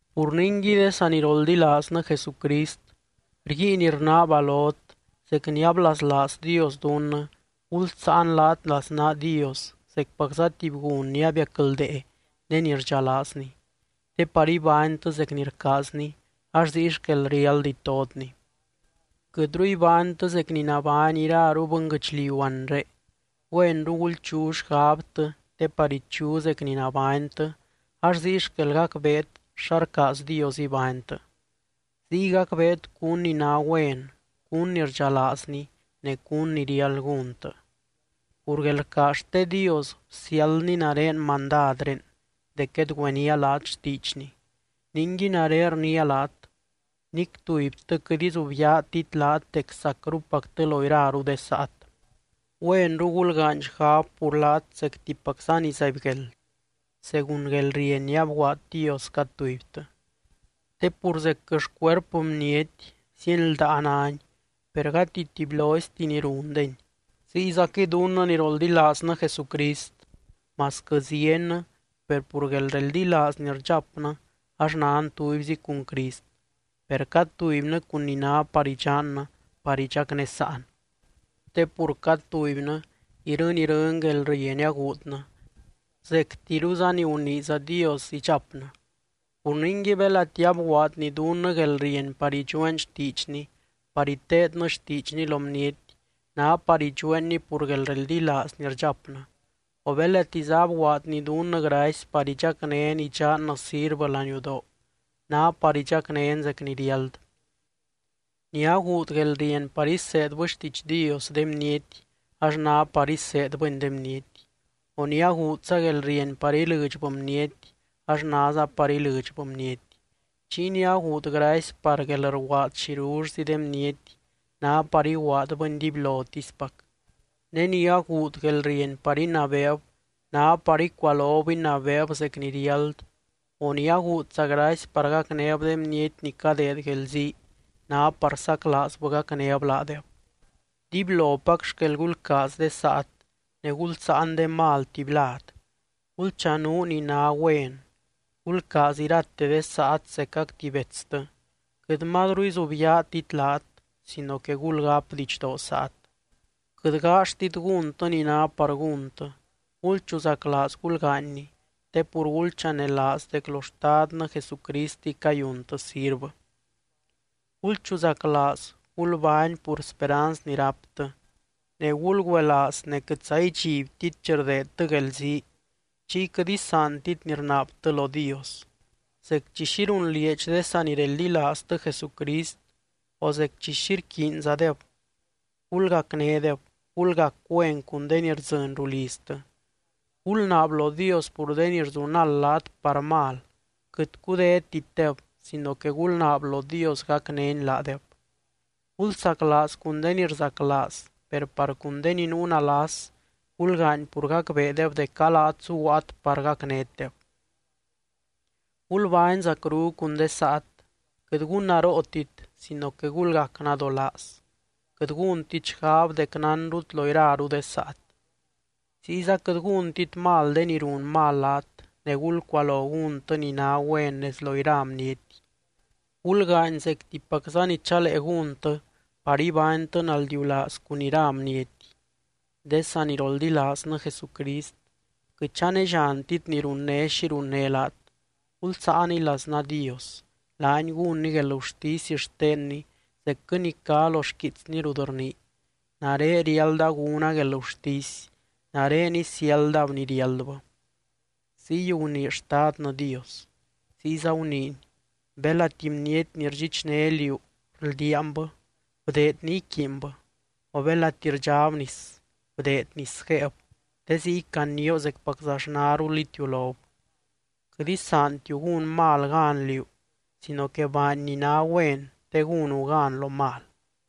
Pur ningui, de saniroldilaaznɨ Jesucrist, rguiin rnaaba lot, zec ni ablaslaaz Dios dunnɨ, gulsáan laat laznaa Dios zecpacza tuby gun ni abiacldee ne ni rdxalaazny. Te par ibánytɨ zec ni rcaazny ax ziy xquel riáld itotny. Quɨtru ibánytɨ zec ni nabány iraru bɨnguɨchliu anre, güenru gulchu xgabtɨ te par ichu zec ni nabánytɨ ax ziy xquel gacbeet xa rcaaz Dios ibánytɨ. Ziy gacbeet cún ni ná güen, cún ni rdxalaazny ne cún ni riáld gúntɨ. Pur guelrcaaz xte Dios bsiáldny nare mandadré dec guedgüeníaa laat xtiidxny. Ningui nare rniia laat, nic tubytɨ quɨt izubyaatit laat dec sacrupactɨ lo iraru de saat. Güenru gulgaany xgab pur laat zectipacza ni zaibgueld, según guelrieny ni abguaad Dios cad tubytɨ. Te pur zecquɨ xcuerpɨ bniety, zieny ldaa náni per gati tubyloizti ni rundeni. Ziyzaquɨy dunnɨ ni roldilaaznɨ Jesucrist, masquɨ ziennɨ, per pur guelreldilaaz ni rdxapnɨ ax nan tubyzi cun Crist, per cad tubynɨ cun ni ná par idxannɨ par idxacnésaan. Te pur cad tubynɨ irɨny, irɨny guelrieny aguudnɨ, zectiruza ni guniiza Dios idxapnɨ. Pur ningui, belati abguaadny dunnɨ guelrieny par idxueen xtiidxny, par iteednɨ xtiidxny lo bniety, ná par idxueenni pur guelreldilaaz ni rdxapnɨ. O belatiza abguaadny dunnɨ gracy par idxacnén idxannɨ sirvɨ laniudoo, ná par idxacnén zec ni riáld. Ni aguud guelrieny par iseedbɨ xtiidx Dios de bniety, ax ná par iseedbɨni de bniety. O ni aguudza guelrieny par ilɨdxbɨ bniety ax náza par ilɨdxbɨ bniety. Chiy ni aguud gracy par guelrguaad xirullzi de bniety, ná par iguaadbɨni dibylotispac. Ne ni aguud guelrieny par inabeeb, ná par icualob inabeeb zec ni riáld, o ni aguudza gracy par gacnéb de bniety ni cadeed guelzii, ná par saclaazbɨ gacnéb laadeb. Dibylopac xquel gulcaaz de saat, ne gulsáan de mal tuby lad, gulchanuu ni ná güen. Gulcaaz irate de saat zecac tuby betstɨ, quɨt mazru izubyaatit laat sino que gulgáp didxdoo saat. Quɨt gaalltit gúntɨ ni ná par gúntɨ, gulchuzaclaaz gulgaanyni te pur gulchanelaaz dec lo Xtadnɨ Jesucristiy cayuntɨ sirvɨ. Gulchuzaclaaz gulbány pur speranz ni ráptɨ, ne gulgüelaaz ne quɨtza idxibtit chi rdeedtɨ guelzii, chiy quɨt isaantit ni rnaabtɨ lo Dios. Zec chi xi runlieedx de sanireldilaaztɨ Jesucrist o zec chi xi rquiinzadeb, gulgacnédeb. Gulgac güen cun de ni rdzɨny ruliztɨ. Gulnaab lo Dios pur de ni rzunald laat par mal, quɨt cudétitdeb sino que gulnaab lo Dios gacnény laadeb. Gulsaclaaz cun de ni rzaclaaz, per par cun de ni nuu nalas, gulgaany pur gacbeedeb dec a laat zuguaat par gacnétdeb. Gulbány zacru cun de saat, quɨt gunnarootit sino que gulgac nadolaaz. Quɨt gúntit xgab dec nánrut lo iraru de saat. Ziyza quɨt gúntit mal de ni run mal laat, ne gulcualo gúntɨ ni ná güen nez lo ira bniety. Gulgaany zectipacza ni chalee gúntɨ par ibánytɨ naldiulaaz cun ira bniety. De saniroldilaaznɨ Jesucrist, quɨt chanelliantit ni runné xi runné laat, gulsaaniy laznaa Dios, laany gúnny guelgurtisy xtenny zecquɨ ni cá lo xquiitsny rut rnii: “Nare riálda gúna guelgurtisy, nare isiáldab ni riáldbɨ. Ziy gunii Xtadnɨ Dios.” Ziyza guniiny: “Belati bniety ni rdxichné liú rldiaanbɨ, bdeed ni iquiinbɨ, o belati rdxáb nis, bdeed nis guéeb, te ziy canioo zecpaczaxnarul itiulob.” Quɨt isaantiu gún mal gan liú sino que baany ni ná güen te gúnu gan lo mal.